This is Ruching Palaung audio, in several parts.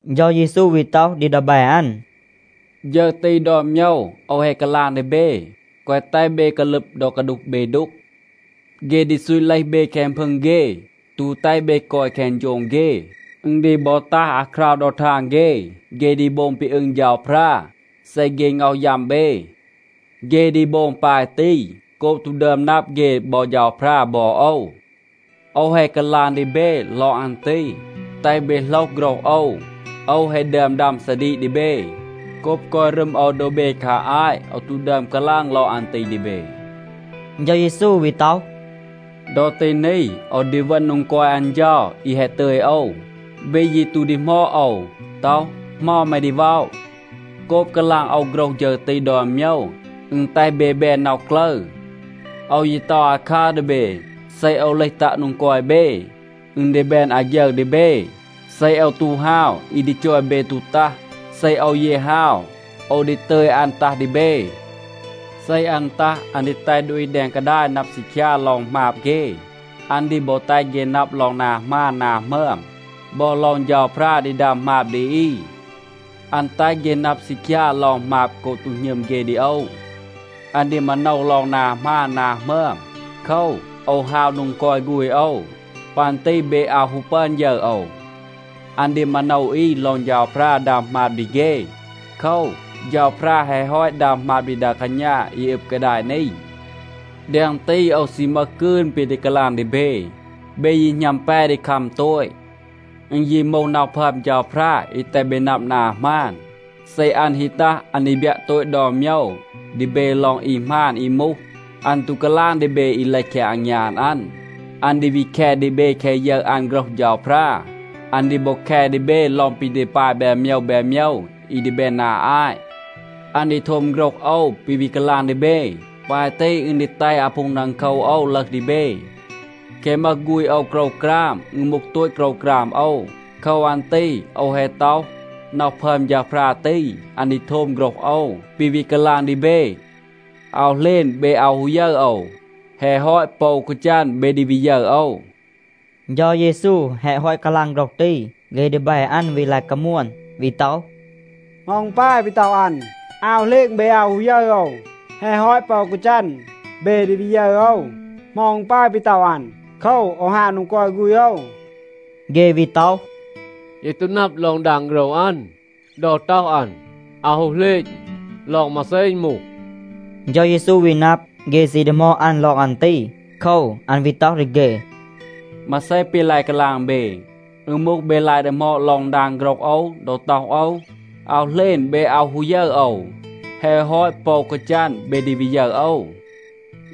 เฌา เยซู วี ต็อห ดี ดีแบ อัน, “ฌึร ตี ดอน โมยว โอว แฮะ กาลาง ดี เบ, แกวะ แตห เบ กาลึบ ดอ กาดูห เบ ดูก. เฆ ดี ซูต เลห เบ แคง พึง เฆ, ตู แตห เบ กอย แคง โฌง เฆ. อึณ ดี บอ ตัห อาคราว ดอ ทาง เฆ, เฆ ดี โบง ปี อึง เฌาพรา, เซ เฆ ง็อห ยัม เบ. เฆ ดี โบง ปาย ตี โกบ ตู ดึอม นับ เฆ บอ เฌาพรา บอ โอว. โอว แฮะ กาลาง ดี เบ ลอง อัน ตี, แตห เบ โหลห โฆรห โอว. โอว แฮะ ดึอม ดัม ซาดีก ดี เบ. โกบ กอย รึม โอว โดบ เบ คา อาต โอว ตู ดึอม กาลาง ลอง อัน ตี ดี เบ.” เฌา เยซู วี ต็อห, “ดอ ตี นี, โอว ดี เวณ โดง กอย อัน เฌา อี แฮะ ตึย โอว. เบ ยี ตู ดีหมอด โอว, ต็อห, ‘เหมา แม ดี ว็อะ?’ โกบ กาลาง โอว โฆรห ฌึร ตี ดอน โมยว, อึณ แตห เบ แบน น็อห กลึร. โอว ยี ต็อห อาคัร ดี เบ, เซ โอว เลห ตัะ โดง กอย เบ, อึณ ดี แบน อาฆยึร ดี เบ. เซ โอว ตู ฮาว, อี ดี จอย เบ ตู ตัห. เซ โอว ยี ฮาว, โอว ดี ตึย อัน ตัห ดี เบ. เซ อัน ตัห, อัน ดี แตห ดูอี แดง กาดาย นับ ซีคยา ลอง หมาบ เฆ. อัน ดี บอ แตห เฆ นับ ลอง นา หมาน นา หมึอม บอ ลอง เฌาพรา ดี ดัม หมาบ ดี อี. อัน แตห เฆ นับ ซีคยา ลอง หมาบ โกบ ตู หณึม เฆ ดี โอว. อัน ดี มาโนว ลอง นา หมาน นา หมึอม. โคว, โอว ฮาว โดง กอย ฆูณ โอว. ปัน ตี เบ อาว ฮู ปึอน ยึร โอว. อัน ดี มาโนว อี ลอง เฌาพรา ดัม หมาบ ดี เฆ. โคว, เฌาพรา แฮะ ฮอต ดัม หมาบ ดี ดา กาณา อี อึบ กาดาย นี. แดง ตี, โอว ซี มึห กืน ปี ดี กาลาง ดี เบ. เบ ยี หณัม แป ดี คัม โตต. อึณ ยี มูห น็อห พึอม เฌาพรา อี แตห เบ นับ นา หมาน, เซ อัน ฮี ตัห, อัน ดี บยัะ โตต ดอน โมยว ดี เบ ลอง อี หมาน อี มูห. อัน ตู กาลาง ดี เบ อี เลห แคง อางยาน อัน. อัน ดี วี แค ดี เบ แคะ ยึร อัน โฆรห เฌาพรา. อัน ดี บอ แค ดี เบ ลอง ปี ดี ปาย แบน โมยว แบน โมยว อี ดี แบน นา อาต. อัน ดี โทม โฆรห โอว, ปี วี กาลาง ดี เบ. ปาย ตี อึณ ดี แตห อาพูง ดังโคว โอว ลึห ดี เบ. แคะ มึห ฆูณ โอว โกรวกราม, อึณ มูห โตต โกรวกราม โอว. โคว อัน ตี โอว แฮะ ต็อห, น็อห พึอม เฌาพรา ตี, อัน ดี โทม โฆรห โอว, ปี วี กาลาง ดี เบ. อาว เหลณ, เบ อาว ฮู ยึร โอว. แฮะ ฮอต, ปอ อู กาจัน, เบ ดี วี ยึร โอว.” เฌา เยซู แฮะ ฮอต กาลาง โฆรห ตี, เฆ ดีแบ อัน วี ลาย กามวน, วี ต็อห, “เหมา อึณ ปาย ปี ต็อห อัน, ‘อาว เหลณ เบ อาว ฮู ยึร โอว. แฮะ ฮอต, ปอ อู กาจัน, เบ ดี วี ยึร โอว’? เหมา อึณ ปาย ปี ต็อห อัน, ‘โคว, โอว ฮาว โดง กอย ฆูณ โอว’?” เฆ วี ต็อห, “เย ตู นับ ลอง ดาง โฆรห อัน, ดอ ต็อห อัน, ‘อาว ฮู เหลณ’ ลอง มาเซ อึณ มูห?” เฌา เยซู วี นับ, เฆ ซี ดีหมอด อัน ลอง อัน ตี. โคว, อัน วี ต็อห ดี เฆ, “มาเซ ปี ลาย กาลาง เบ? อึณ มูห, เบ ลาย ดีหมอด ลอง ดาง โฆรห โอว ดอ ต็อห โอว, ‘อาว เหลณ เบ อาว ฮู ยึร โอว. แฮะ ฮอต, ปอ อู กาจัน เบ ดี วี ยึร โอว’?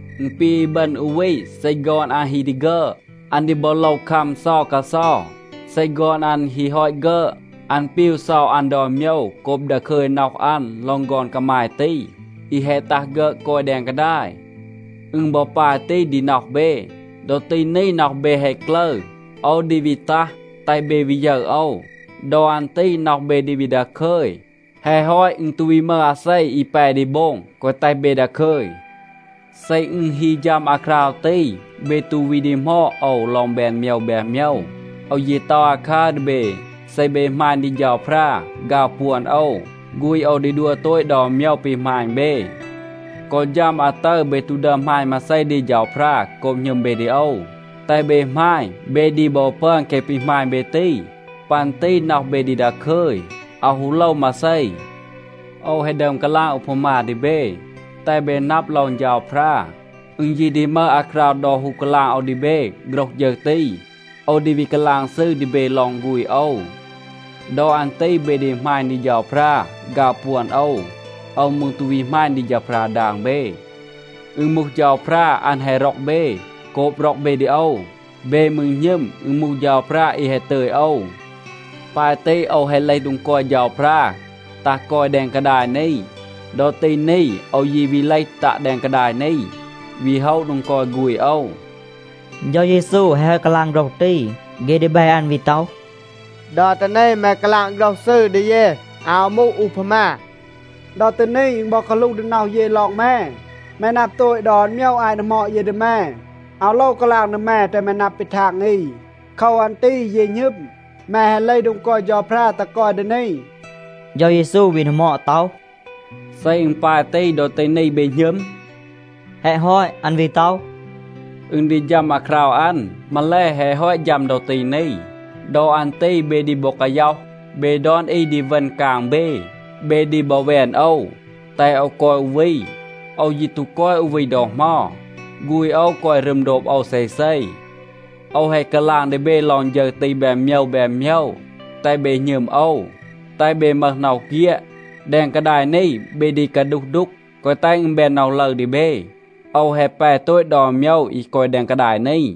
อึณ ปี อีบึณ อู วี, เซ ฆอน อัน ฮี ดี ฆึอด, อัน ดี บอ โลว คัม เซา กาเซา. เซ ฆอน อัน ฮี ฮอต ฆึอด, อัน ปีว เซา อัน ดอน โมยว โกบ ดาคึย น็อห อัน ลอง ฆอน กามาย ตี, อี แฮะ ตัห ฆึอด กอย แดง กาดาย. อึณ บอ ปาย ตี ดี น็อห เบ. ดอ ตี นี น็อห เบ แฮะ กลึร. โอว ดี วี ตัห, แตห เบ วี ยึร โอว. ดอ อัน ตี น็อห เบ ดี วี ดาคึย. แฮะ ฮอต, อึณ ตู วี มึห อาเซ อี แป ดี โบง แกวะ แตห เบ ดาคึย. เซ อึณ ฮี ฌัม อาคราว ตี, เบ ตู วี ดีหมอด โอว ลอง แบน โมยว แบน โมยว. โอว ยี ต็อห อาคัร ดี เบ. เซ เบ หมาณ ดี เฌาพรา, ฆาว ปวน โอว, ฆูณ โอว ดี ดัว โตต ดอน โมยว ปี หมาณ เบ. กอ ฌัม อาตึร, เบ ตู ดึอม หมาณ มาเซ ดี เฌาพรา โกบ หณึม เบ ดี โอว. แตห เบ หมาณ, เบ ดี บอ ปึอน แคะ ปี หมาณ เบ ตี. ปัน ตี น็อห เบ ดี ดาคึย, อาว ฮู โลว มาเซ. โอว แฮะ ดึอม กาลาง อูพามา ดี เบ, แตห เบ นับ ลอง เฌาพรา. อึณ ยี ดี มึห อาคราว ดอ ฮู กาลาง โอว ดี เบ โฆรห ฌึร ตี. โอว ดี วี กาลาง ซืร ดี เบ ลอง ฆูณ โอว. ดอ อัน ตี เบ ดี หมาณ ดี เฌาพรา, ฆาว ปวน โอว. โอว มืร ตู วี หมาณ ดี เฌาพรา ดาง เบ. อึณ มูห เฌาพรา, อัน แฮะ ร็อก เบ โกบ ร็อก เบ ดี โอว. เบ มืร หณึม, อึณ มูห เฌาพรา อี แฮะ ตึย โอว. ปาย ตี, โอว แฮะ เลห โดง กอย เฌาพรา, ตัห กอย แดง กาดาย นี. ดอ ตี นี โอว ยี วี เลห ตัะ แดง กาดาย นี, วี โฮะ โดง กอย ฆูณ โอว.” เฌา เยซู แฮะ ฮอต กาลาง โฆรห ตี, เฆ ดีแบ อัน วี ต็อห, “ดอ ตี นี แม กาลาง โฆรห ซืร ดี เย. อาว มูห อูพามา. ดอ ตี นี, อึณ บอ กาหลูห ดี น็อห เย ลอง แม. แม นับ โตต ดอน โมยว อาต ดีหมอด เย ดี แม. อาว โลว กาลาง ดี แม, แตห แม นับ ปี ทาง อี. โคว อัน ตี เย หณึม, แม แฮะ เลห โดง กอย เฌาพรา, ตัห กอย ดี นี.” เฌา เยซู วี ดีหมอด ต็อห, “เซ อึณ ปาย ตี, ดอ ตี นี เบ หณึม?” แฮะ ฮอต, อัน วี ต็อห, “อึณ ดี ฌัม อาคราว อัน, มาแล, แฮะ ฮอต ฌัม ดอ ตี นี. ดอ อัน ตี เบ ดี บอ กาย็อห. เบ ดอน อี ดี เวณ กาง เบ. เบ ดี บอ แวน โอว, แตห โอว กอย อู วี. โอว ยี ตู กอย อู วี ดอ เหมา. ฆูณ โอว กอย รึม โดบ โอว เซเซ. โอว แฮะ กาลาง ดี เบ ลอง ฌึร ตี แบน โมยว แบน โมยว, แตห เบ หณึม โอว, แตห เบ มึห น็อห เฆียด. แดง กาดาย นี เบ ดี กาดูห ดูก. แกวะ แตห อึณ แบน น็อห ลึร ดี เบ. โอว แฮะ แป โตต ดอน โมยว อี กอย แดง กาดาย นี.”